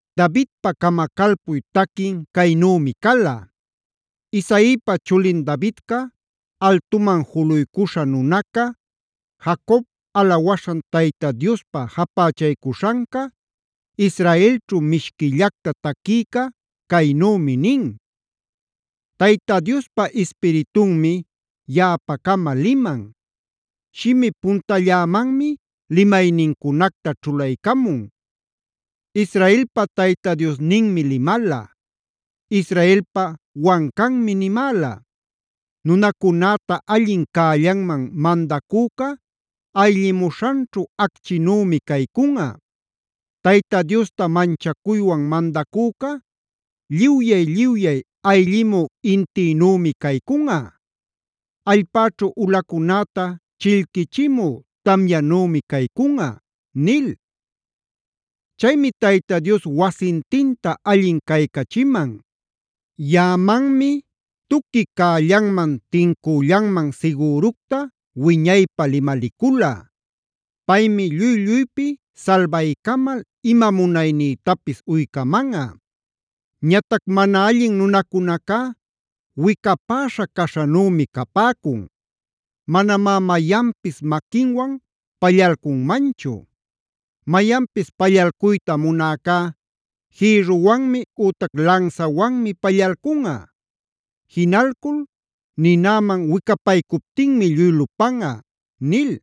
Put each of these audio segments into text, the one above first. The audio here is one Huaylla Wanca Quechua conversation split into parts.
Davidpa camacalpuy taquin caynümi cala: Isaipa chulin Davidca, altuman juluycuśha nunaca, Jacob alawaśhan Tayta Diospa japächaycuśhanca, Israelćhu mishquillacta taquïca caynümi nin: “Tayta Diospa Ispiritunmi yaꞌapa-cama liman; shimi puntallämanmi limaynincunacta ćhulaycamun. Israelpa Tayta Diosninmi limala, Israelpa wancanmi nimäla: ‘Nunacunäta allin cällanman mandacüca ayllimuśhanćhu acchïnümi caycunꞌa. Tayta Diosta manchacuywan mandacüca, lliwyay-lliwyay ayllimü intïnümi caycunꞌa. Allpäćhu ulacunäta chillquichimü tamyanümi caycunꞌa’ nil. Chaymi Tayta Dios wasintinta allin caycachiman. Yaꞌamanmi tuqui cällanman tincüllanman sigüructa wiñaypä limalicula. Paymi lluy-lluypi salbaycamal ima munaynïtapis uycamanꞌa. Ñatac mana allin nunacunacá wicapäśha caśhanümi capäcun. Manamá mayanpis maquinwan pallalcunmanchu. Mayanpis pallalcuyta munäcá jïrruwanmi ütac lansawanmi pallalcunꞌa. Jinalcul ninäman wicapaycuptinmi lluy lupanꞌa” nil.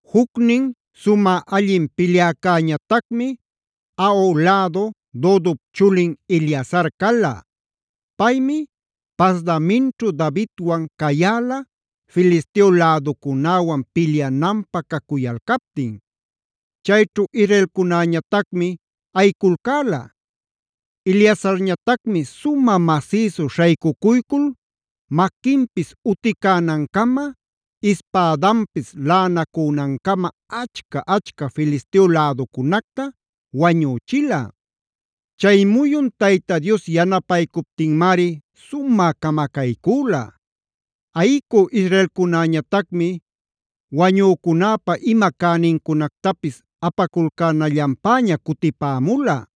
Jucnin sumä allin pilyäcäñatacmi Ahoh lädu Dodop chulin Eleazar cala. Paymi Pasdaminćhu Davidwan cayäla Filisteo läducunäwan pilyananpä cacuyalcaptin. Chayćhu israelcunäñatacmi ayiculcäla. Eleazarñatacmi sumä masïsu śhaycucuycul maquinpis uticänancama, ispädanpis laꞌanacünancama achca-achca Filisteo läducunacta wañüchila. Chay muyun Tayta Dios yanapaycuptinmari sumä camacaycüla. Ayicü israelcunäñatacmi wañücunäpa ima cänincunactapis apaculcänallanpäña cutipämula.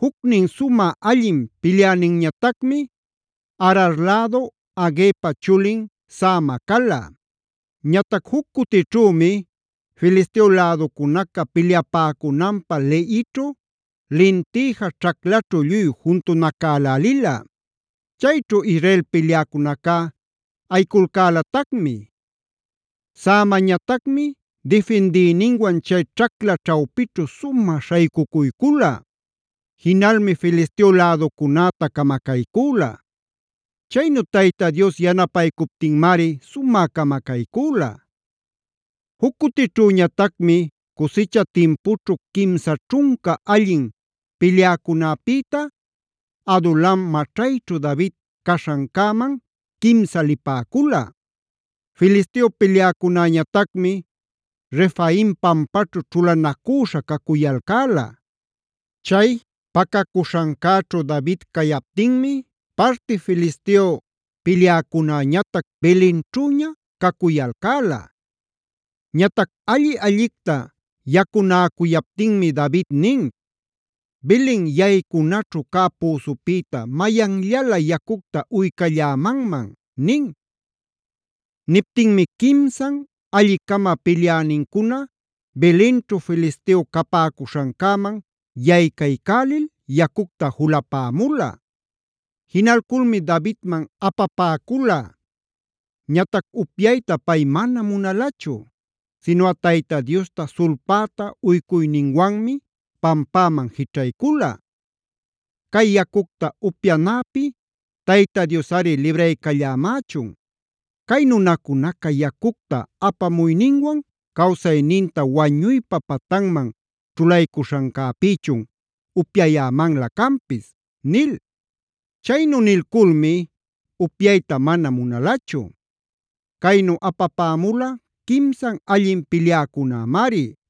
Jucnin sumä allin pilyäninñatacmi Arar lädu Agepa chulin Sama cala. Ñatac juc cutićhümi Filisteo läducunaca pilyapäcunanpä Lehićhu lintïja ćhaclaćhu lluy juntunacälälila. Chayćhu Israel pilyäcunacá ayiculcälatacmi. Samañatacmi difindïninwan chay ćhacla ćhawpićhu sumä śhaycucuycula. Jinalmi Filisteo läducunäta camacaycüla. Chaynu Tayta Dios yanapaycuptinmari sumä camacaycüla. Juc cutićhüñatacmi cusicha timpućhu quimsa ćhunca allin pilyäcunäpïta Adulam maćhayćhu David caśhancäman quimsa lipäcula. Filisteo pilyäcunäñatacmi Refaim pampaćhu ćhulanacüśha cacuyalcäla. Chay pacacuśhancäćhu David cayaptinmi parti Filisteo pilyäcunäñatac Belenćhüña cacuyalcäla. Ñatac alli-allicta yacunäcuyaptinmi David nin: “¡Belen yaycunaćhu cä püsupïta mayanllalä yacucta uycallämanman!” nin. Niptinmi quimsan alli-cama pilyänincuna Belenćhu Filisteo capäcuśhancäman yaycaycälil yacucta julapämula. Jinalculmi Davidman apapäcula. Ñatac upyayta pay manam munalachu; sinuꞌa Tayta Diosta sulpäta ucuyninwanmi pampäman jićhaycula: “Cay yacucta upyanäpi Tayta Diosꞌari libraycallämächun. Cay nunacunaca yacucta apamuyninwan cawsayninta wañuypa patanman ćhulaycuśhancäpïchun upyayämanlä canpis” nil. Chaynu nilculmi upyayta mana munalachu. Caynu apapämula quimsan allin pilyäcunämari.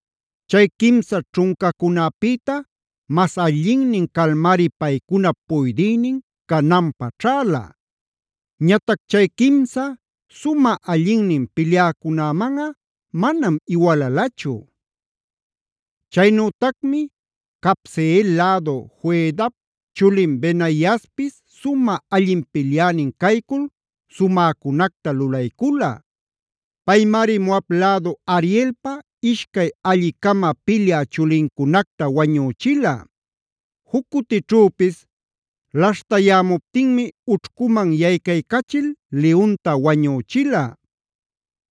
Chay quimsa ćhuncacunäpïta mas allinnin calmari paycunap puydïnin cananpä ćhäla. Ñatac chay quimsa sumä allinnin pilyäcunämanꞌa manam iwalalachu. Chaynütacmi Cabseel lädu Joiadap chulin Benaiaspis sumä allin pilyänin caycul sumäcunacta lulaycula. Paymari Moab lädu Arielpa ishcay alli-cama pilyä chulincunacta wañüchila. Juc cutićhüpis laśhtayämuptinmi ućhcuman yaycaycachil liyunta wañüchila.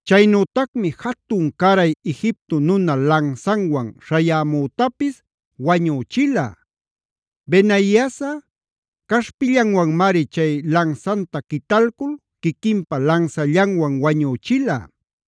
Chaynütacmi jatun-caray Egipto nuna lansanwan śhayämütapis wañüchila. Benaiasꞌa caśhpillanwanmari chay lansanta quitalcul quiquinpa lansallanwan wañüchila.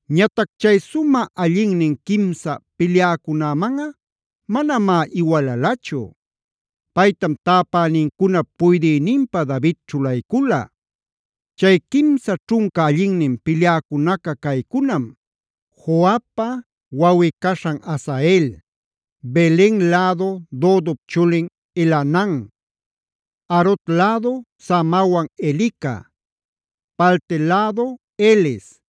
Ñatac chay sumä allinnin quimsa pilyäcunämanꞌa manamá iwalalachu. Paytam tapänincunap puydïninpä David ćhulaycula. Chay quimsa ćhunca allinnin pilyäcunaca caycunam: Joabpa wawꞌi-caśhan Asael, Belen lädu Dodop chulin Elhanan, Harod lädu Samawan Elica, Palti lädu Heles,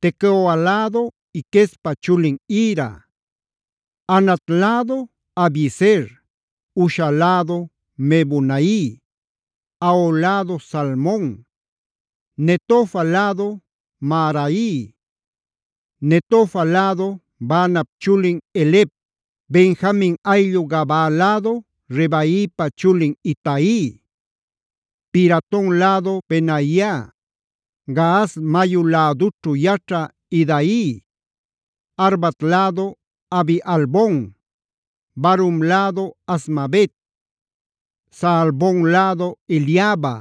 Tecoa lädu Iquespa chulin Ira, Anat lädu Abiezer, Husha lädu Mebunai, Ahoh lädu Salmon, Netofa lädu Maharai, Netofa lädu Baanap chulin Heleb, Benjamin ayllu Gabaa lädu Ribaipa chulin Itai, Piraton lädu Benaia, Gaas mayu lädućhu yaćhä Hidai, Arbat lädu Abi-albon, Barhum lädu Azmavet, Saalbon lädu Eliaba,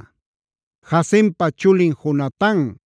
Jasenpa chulin Jonatan,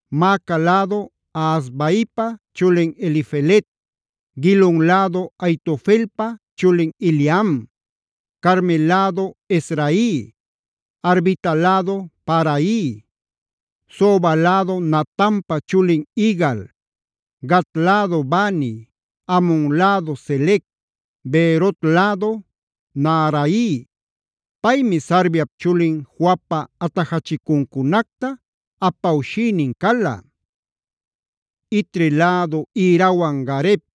Maaca lädu Ahasbaipa chulin Elifelet, Gilon lädu Ahitofelpa chulin Eliam, Carmel lädu Hezrai, Arbita lädu Paarai, Soba lädu Natanpa chulin Igal, Gad lädu Bani, Amon lädu Selec, Beerot lädu Naharai; paymi Sarviap chulin Joabpa atajachicuncunacta apawshïnin cala. Itri lädu Irawan Gareb,